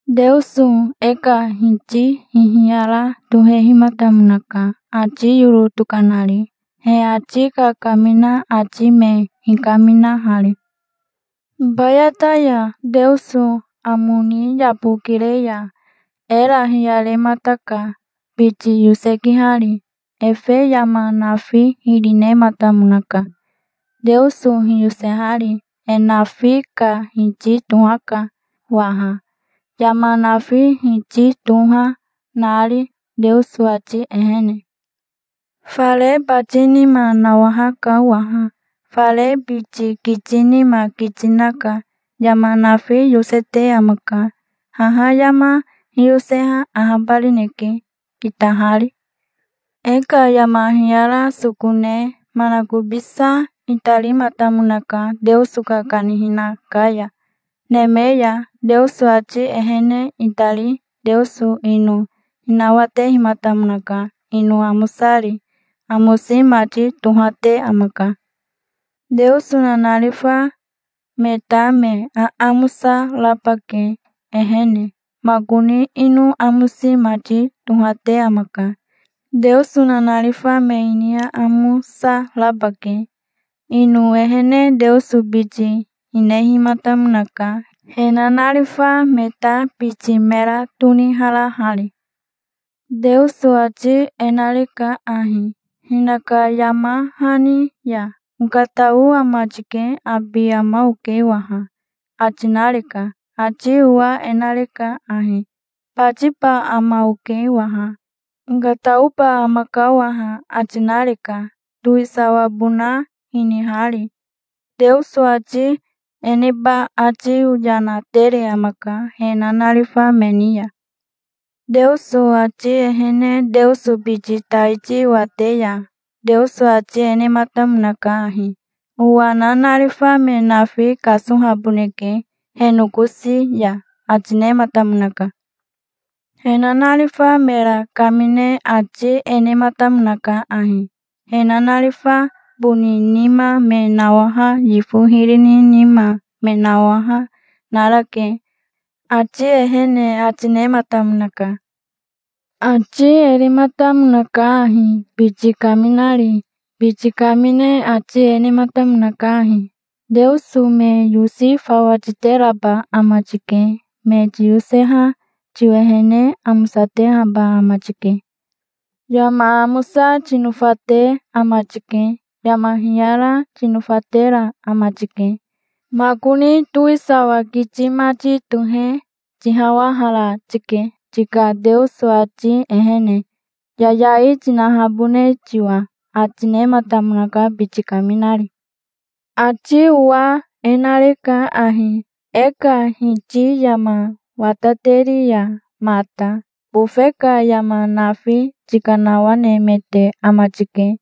Teoso e ka iti hihiyara tohehimatamonaka, ati yoro tokanari, he ati kakamina ati me hikaminahari. Hibayata ya Teoso amo ni yabokire ya era hiyaremataka, biti yosekihari. Efe yama nafi hiri nematamonaka, Teoso hiyosehari. E nafi ka Hiti tohaka waha, yama nafi Hiti toha nari, Teoso ati ehene. Fare bati nima nawahaka waha. Fare bati kiti nima kiti naka. Yama nafi yosete amaka. Haha yama hiyoseha ahabarineke, kitahari. E ka yama hiyara soko ne manakobisa itarimatamonaka Teoso ka kanihina ka ya, neme ya. Teoso ati ehene itari Teoso ino hinawatematamonaka, ino amosari. Amosi mati tohate amaka. Teoso nanarifa me ta me aamosa raba ke, ehene. Makoni ino amosi mati tohate amaka. Teoso nanarifa me ini aamosa raba ke, ino ehene. Teoso biti hinihematamonaka, he nanarifa me ta biti mera toniharahari. Teoso ati e nareka ahi, hinaka yama hani ya: "Okatao ama tike. Abi ama oke waha", ati nareka. Ati owa e nareka ahi: "Batiba ama oke waha. Okataoba amaka waha", ati nareka, towisawabona hinihari. Teoso ati e neba ati yana tere amaka he nanarifa me ni ya. Teoso ati ehene Teoso biti taiti wate ya Teoso ati e nematamonaka ahi: "Owa nanarifa me nafi kasohaboneke he nokosi ya", ati nematamonaka. He nanarifa mera kamine ati e nematamonaka ahi: "He nanarifa boni nima me nawaha, yifo hiri ni nima me nawaha narake, ati ehene", ati nematamonaka. Ati e rematamonaka ahi biti kaminari. Biti kamine ati e nematamonaka ahi: "Teoso me yosi fawa titeraba ama tike. Me tiyoseha tiwehene amosatehaba ama tike. Yama amosa tinofate ama tike. Yama hiyara tinofatera ama tike. Makoni towisawa kiti mati tohe tihawahara tike, tika Teoso ati ehene, yayai tinahabone tiwa", ati nematamonaka biti kaminari. Ati owa e nareka ahi: "E ka Hiti yama watateri ya mata bofe ka yama nafi tikanawanemete ama tike.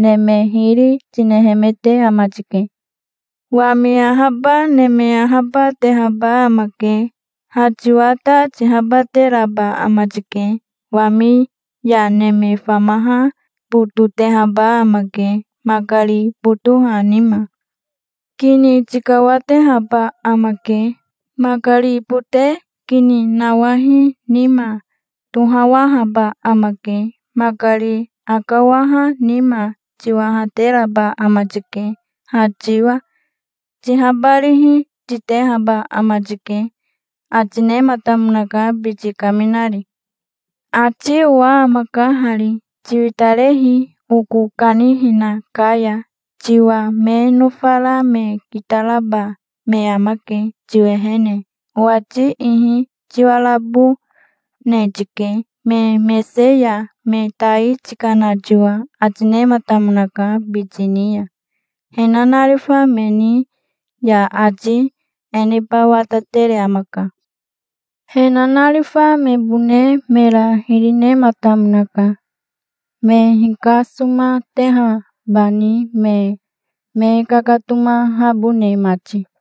Neme hiri, tinehemete ama tike. Wami ahaba, neme ahaba, tehaba amake. Ha tiwa ta tihabateraba ama tike. Wami ya neme famaha bototehaba amake, makari botoha nima. Kini tikawatehaba amake, makari bote kini nawahi nima. Tohawahaba amake, makari akawaha nima. Tihawateraba ama tike ha tiwa. Tihabarihi titehaba ama tike", ati nematamonaka, biti kaminari. Ati owa amaka hari: "Tiwitarehi oko kanihina ka ya. Tiwa me nofara me kitaraba me amake tiwehene, owati ihi. Tiwariabone tike me mese ya, me tai tikana tiwa", ati nematamonaka biti ni ya. He nanarifa me ni ya ati e neba watatere amaka. He nanarifa mebone mera hiri nematamonaka, me hikasomatehabani me me kakatomahabone mati.